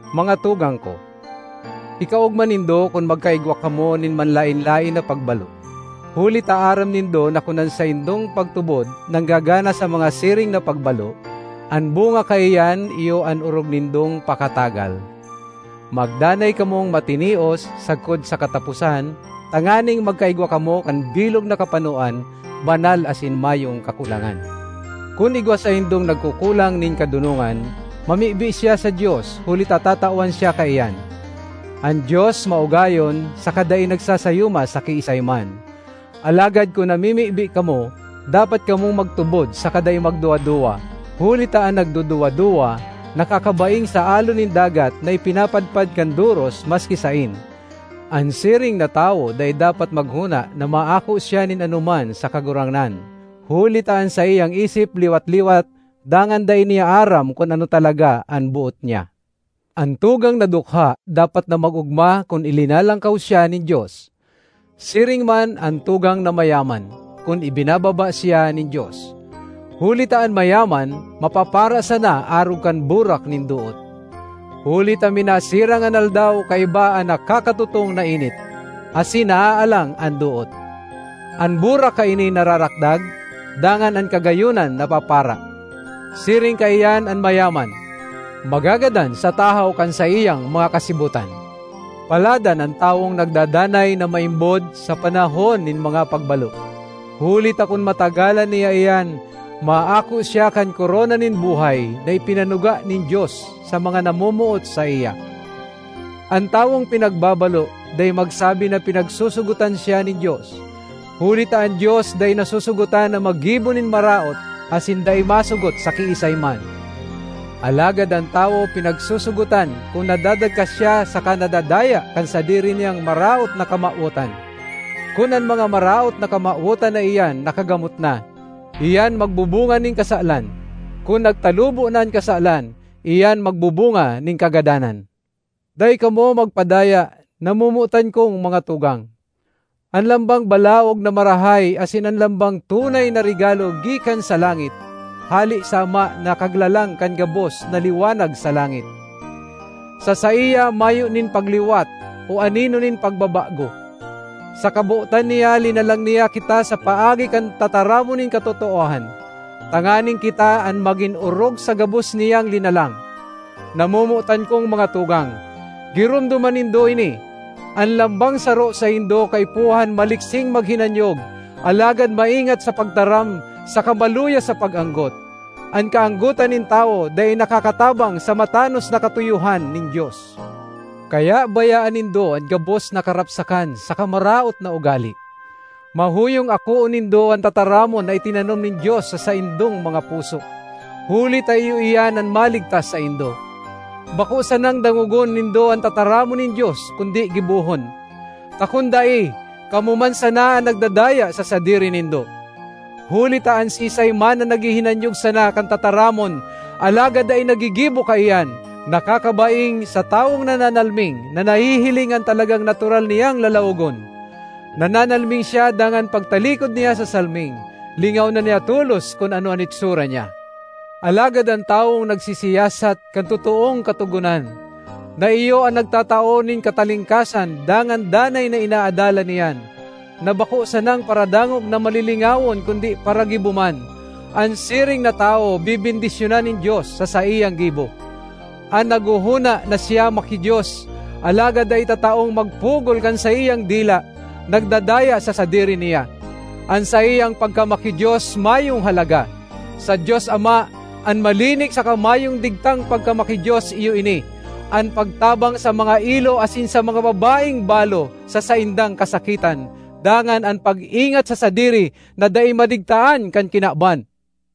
Mga tugang ko, ikaogma nindo kun magkaigwa kamo nin manlaen-laen na pagbalo, huli ta aram nindo na kun an saindong pagtubod nanggagana sa mga siring na pagbalo, an bunga kaiyan iyo an orog nindong pakatagal. Magdanay kamong matinios sagkod sa kataposan, tanganing magkaigwa kamo kan bilog na kapanoan, banal asin mayong kakulangan. Kun igwa saindong nagkukulang nin kadonongan, mamibi siya sa Dios, huli ta tatawan siya kaiyan; an Dios maugayon saka dai nagsasayuma sa kiisay man. Alagad kun namimibi kamo, dapat kamong magtubod saka dai magduwa-duwa, huli ta an nagduduwa-duwa nakakabaing sa alon nin dagat na ipinapadpad kan doros maski saen. An siring na tawo dai dapat maghona na maako siya nin anoman sa Kagurangnan, huli ta an saiyang isip liwat-liwat dangan dai niya aram kun ano talaga an boot niya. An tugang na dukha dapat na mag-ogma kun ilinalangkaw siya nin Dios; siring man an tugang na mayaman, kun ibinababa siya nin Dios; huli ta an mayaman mapapara sana arog kan burak nin doot. Huli ta minasirang an aldaw kaiba an nakakatutong na init, asin naaalang an doot; an burak kaini nararakdag, dangan an kagayonan napapara. Siring kaiyan an mayaman: magagadan sa tahaw kan saiyang mga kasibotan. Paladan an tawong nagdadanay na maimbod sa panahon nin mga pagbalo, huli ta kun matagalan niya iyan, maako siya kan korona nin buhay na ipinanuga nin Dios sa mga namomoot saiya. An tawong pinagbabalo dai magsabi na pinagsosogotan siya nin Dios. Huli ta an Dios dai nasosogotan na maggibo nin maraot asin dai masogot sa kiisay man. Alagad an tawo pinagsosogotan kun nadadagka siya saka nadadaya kan sadiri niyang maraot na kamawotan. Kun an mga maraot na kamawotan na iyan nakagamot na, iyan magbubunga nin kasalan; kun nagtalubo na an kasalan, iyan magbubunga nin kagadanan. Dai kamo magpadaya, namomotan kong mga tugang! An lambang balaog na marahay asin an lambang tunay na regalo gikan sa langit, hale sa Ama na Kaglalang kan gabos na liwanag sa langit. Sa saiya mayo nin pagliwat o anino nin pagbabago. Sa kabotan niya linalang niya kita sa paagi kan tataramon nin katotoohan, tanganing kita an magin orog sa gabos niyang linalang. Namomotan kong mga tugang, giromdoma nindo ini: an lambang saro saindo kaipuhan maliksing maghinanyog, alagad maingat sa pagtaram saka maluya sa pag-anggot. An kaanggotan nin tawo dai nakakatabang sa matanos na katuyohan nin Dios. Kaya bayaan nindo an gabos na karapsakan saka maraot na ugale. Mahuyong akoon nindo an tataramon na itinanom nin Dios sa saindong mga puso, huli ta iyo iyan an maligtas saindo. Bako sanang dangogon nindo an tataramon nin Dios kundi gibohon; ta kun dai, kamo man sana an nagdadaya sa sadiri nindo. Huli ta an siisay man na naghihinanyog sana kan tataramon alagad dai naggigibo kaiyan, nakakabaing sa tawong nananalming na nahihiling an talagang natural niyang lalawogon. Nananalming siya dangan pagtalikod niya sa salming, lingaw na niya tolos kun ano an itsura niya. Alagad an tawong nagsisiyasat kan totoong katogonan, na iyo an nagtatao nin katalingkasan, dangan danay na inaadalan iyan—na bako sanang paradangog na malilingawon kundi paragibo man—an siring na tawo bebendisyonan nin Dios sa saiyang gibo. An naghohona na siya maki-Dios, alagad dai tataong magpugol kan saiyang dila, nagdadaya sa sadiri niya; an saiyang pagkamaki-Dios mayong halaga. Sa Dios Ama, an malinig saka mayong digtang pagkamaki-Dios iyo ini: an pagtabang sa mga ilo asin sa mga babaeng balo sa saindang kasakitan, dangan an pag-ingat sa sadiri na dai madigtaan kan kinaban.